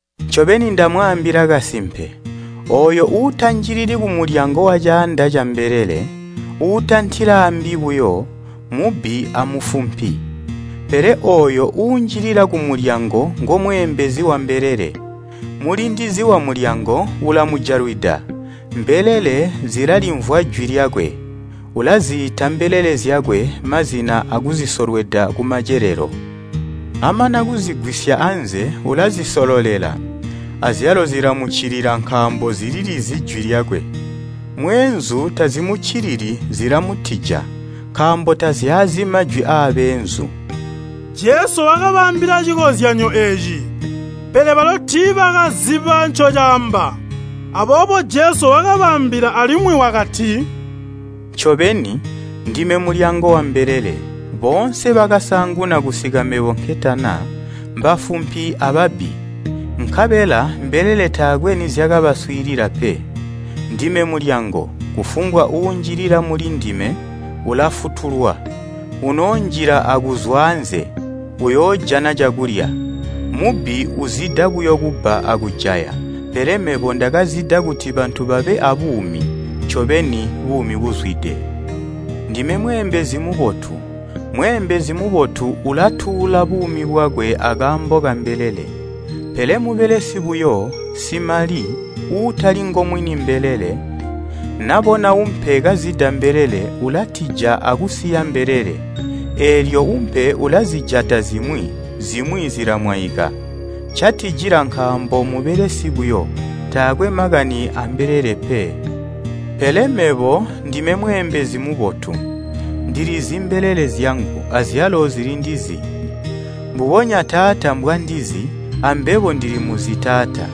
“Ncobeni ndamwaambila kasimpe, ooyo uutanjilili kumulyango wacaanda cambelele, uutantila aambi buyo, mmubbi amufumpi. Pele ooyo uunjilila kumulyango ngomweembezi wambelele. Mulindizi wamulyango ulamujalwida, mbelele zilalimvwa jwi lyakwe. Ulaziita mbelele zyakwe mazina akuzisolweda kumacelelo. Amana kuzigwisya anze ulazisololela, azyalo zilamuccilila nkaambo zililizi jwi lyakwe. Mweenzu tazimuccilili, zilamutija, nkaambo tazyaazi majwi aabeenzu.” Jesu wakabaambila cikonzyanyo eeci, pele balo tiibakaziba ncocaamba. Aboobo Jesu wakabaambila alimwi wakati, “Ncobeni, ndime mulyango wambelele. Boonse bakasaanguna kusika mebo nketana, mbafumpi ababbi, nkabela mbelele taakwe nizyakabaswiilila pe. Ndime mulyango, kufumbwa uunjilila mulindime ulafutulwa. Unoonjila akuzwa anze, uyoojana cakulya. Mubbi uzida buyo kubba akujaya, pele mebo ndakazida kuti bantu babe aabuumi, ncobeni buumi buzwide. “Ndime mweembezi mubotu. Mweembezi mubotu ulatuula buumi bwakwe akaambo kambelele. Pele mubelesi buyo, simali, uutali ngomwini mbelele, nabona umpe kazida mbelele, ulatija akusiya mbelele, eelyo umpe ulazijata zimwi, zimwi zilamwaika. Ncatijila nkaambo mmubelesi buyo. Takwe makani ambelele pe. Pele mebo ndime mweembezi mubotu, ndilizi mbelele zyangu, azyalo zilindizi, mbubonya Taata mbwandizi, ambebo ndilimuzi Taata.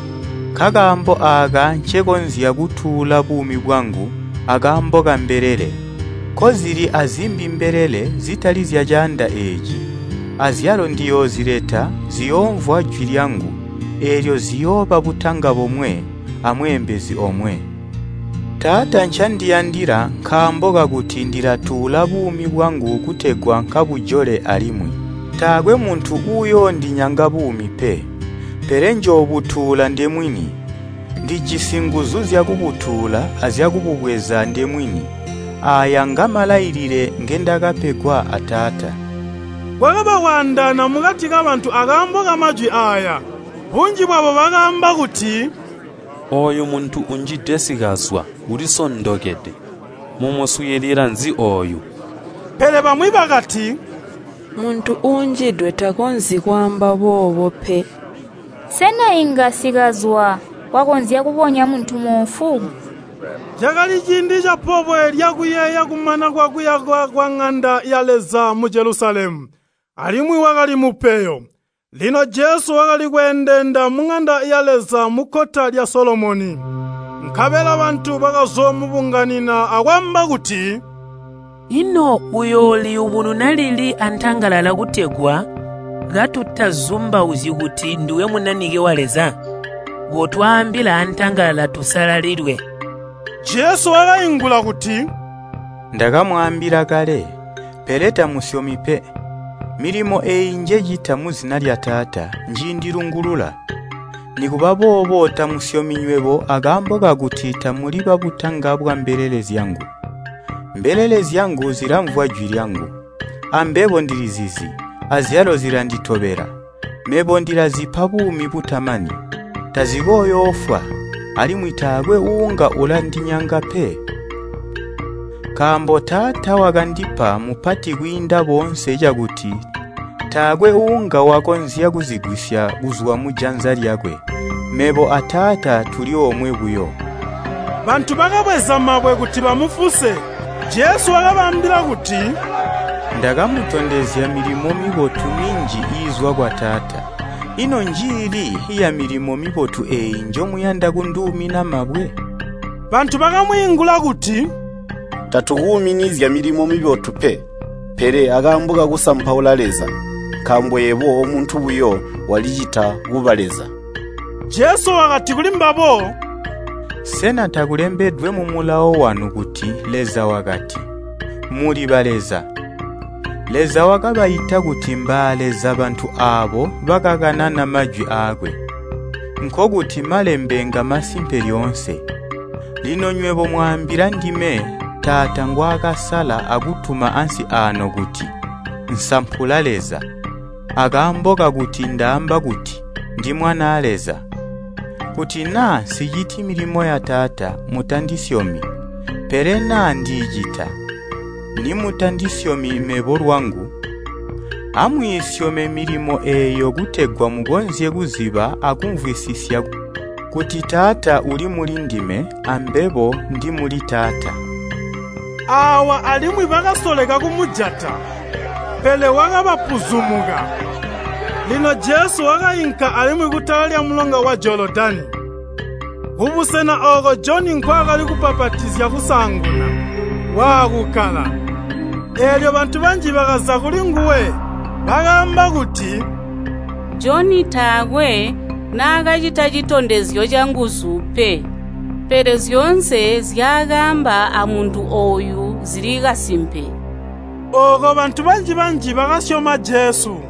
Nkakaambo aaka ncekonzya kutuula buumi bwangu akaambo kambelele. Nkozili azimbi mbelele, zitali zyacaanda eeci. Azyalo ndiyoozileta, ziyoomvwa jwi lyangu, eelyo ziyooba butanga bomwe, amweembezi omwe. “Taata ncandiyandila nkaambo kakuti ndilatuula buumi bwangu kutegwa nkabujole alimwi. Taakwe muntu uuyoondinyanga buumi pe, pele njoobutuula ndemwini. Ndijisi nguzu zyakubutuula azyakububweza ndemwini. Aaya ngamalailile ngendakapegwa a Taata.” Kwakaba kwaandaana mukati kabantu akaambo kamajwi aaya. Bunji bwabo bakaamba kuti, “Ooyu muntu unjidwe sikazwa, ulisondokede. Mumuswiililila nzi ooyu?” Pele bamwi bakati, “Muntu uunjidwe takonzyi kwaamba boobo pe. Sena inga sikazwa wakonzya kubonya muntu moofu?” Cakali ciindi capobwe lyakuyeeya kumana kwakuyakwa kwaŋanda ya Leza mu Jelusalemu, alimwi wakali mupeyo. Lino Jesu wakali kweendeenda muŋanda ya Leza mukkota lya Solomoni. Nkabela bantu bakazoomubunganina akwaamba kuti, “Ino uyooliyubununa lili antangalala kutegwa katutazumbauzyi kuti nduwe Munanike wa Leza? Kotwaambila antangalala tusalalilwe.” Jesu wakaingula kuti, “Ndakamwaambila kale, pele tamusyomi pe. Milimo eeyi njecita muzina lya Taata njiindilungulula. Nikuba boobo tamusyomi nywebo akaambo kakuti tamuli babutanga bwambelele zyangu. Mbelele zyangu zilamvwa jwi lyangu, ambebo ndilizizi, azyalo zilanditobela. Mebo ndilazipa buumi butamani. Tazikooyoofwa, alimwi taakwe uunga ulandinyanga pe. Nkaambo Taata wakandipa mmupati kwiinda boonse cakuti taakwe uunga wakonzya kuzigwisya kuzwa mujanza lyakwe. Mebo a Taata tuli omwe buyo.” Bantu bakabweza mabwe kuti bamufuse. Jesu wakabaambila kuti, “Ndakamutondezya milimo mibotu minji iizwa kwa Taata. Ino njiili yamilimo mibotu eeyi njomuyanda kunduumina mabwe?” Bantu bakamwiingula kuti, “Tatukuumini zyamilimo mibotu pe, pele akaambo kakusampaula Leza. Nkaambo yebo omuntu buyo, walicita kuba Leza.” Jesu wakati kulimbabo, “Sena takulembedwe mu Mulawo wanu kuti Leza wakati, ‘Muli baleza!’ Leza wakabaita kuti mbaaleza bantu aabo bakakanana majwi aakwe. Nkokuti Malembe ngamasimpe lyoonse. Lino nywebo mwaambila ndime Taata ngwaakasala akutuma ansi aano kuti, nsampula Leza, akaambo kakuti ndaamba kuti, ‘Ndi Mwanaa Leza!’ Kuti naa nsiciti milimo ya Taata, mutandisyomi. Pele naa ndiicita, nimutandisyomi mebo lwangu, amwiisyome milimo eeyo kutegwa mukonzye kuziba akumvwisisya kuti Taata uli mulindime, ambebo ndi muli Taata.” Aawa alimwi bakasoleka kumujata, pele wakabapuzumuka. Lino Jesu wakainka alimwi kutala lyamulonga wa Jolodani, kubusena ooko Joni nkwaakali kubbapatizya kusaanguna, waakukkala. Eelyo bantu banji bakaza kulinguwe, bakaamba kuti, “Joni taakwe naakacita citondezyo canguzu pe, pele zyoonse nzyaakaamba amuntu ooyu zili kasimpe.” Ooko bantu banji-banji bakasyoma Jesu.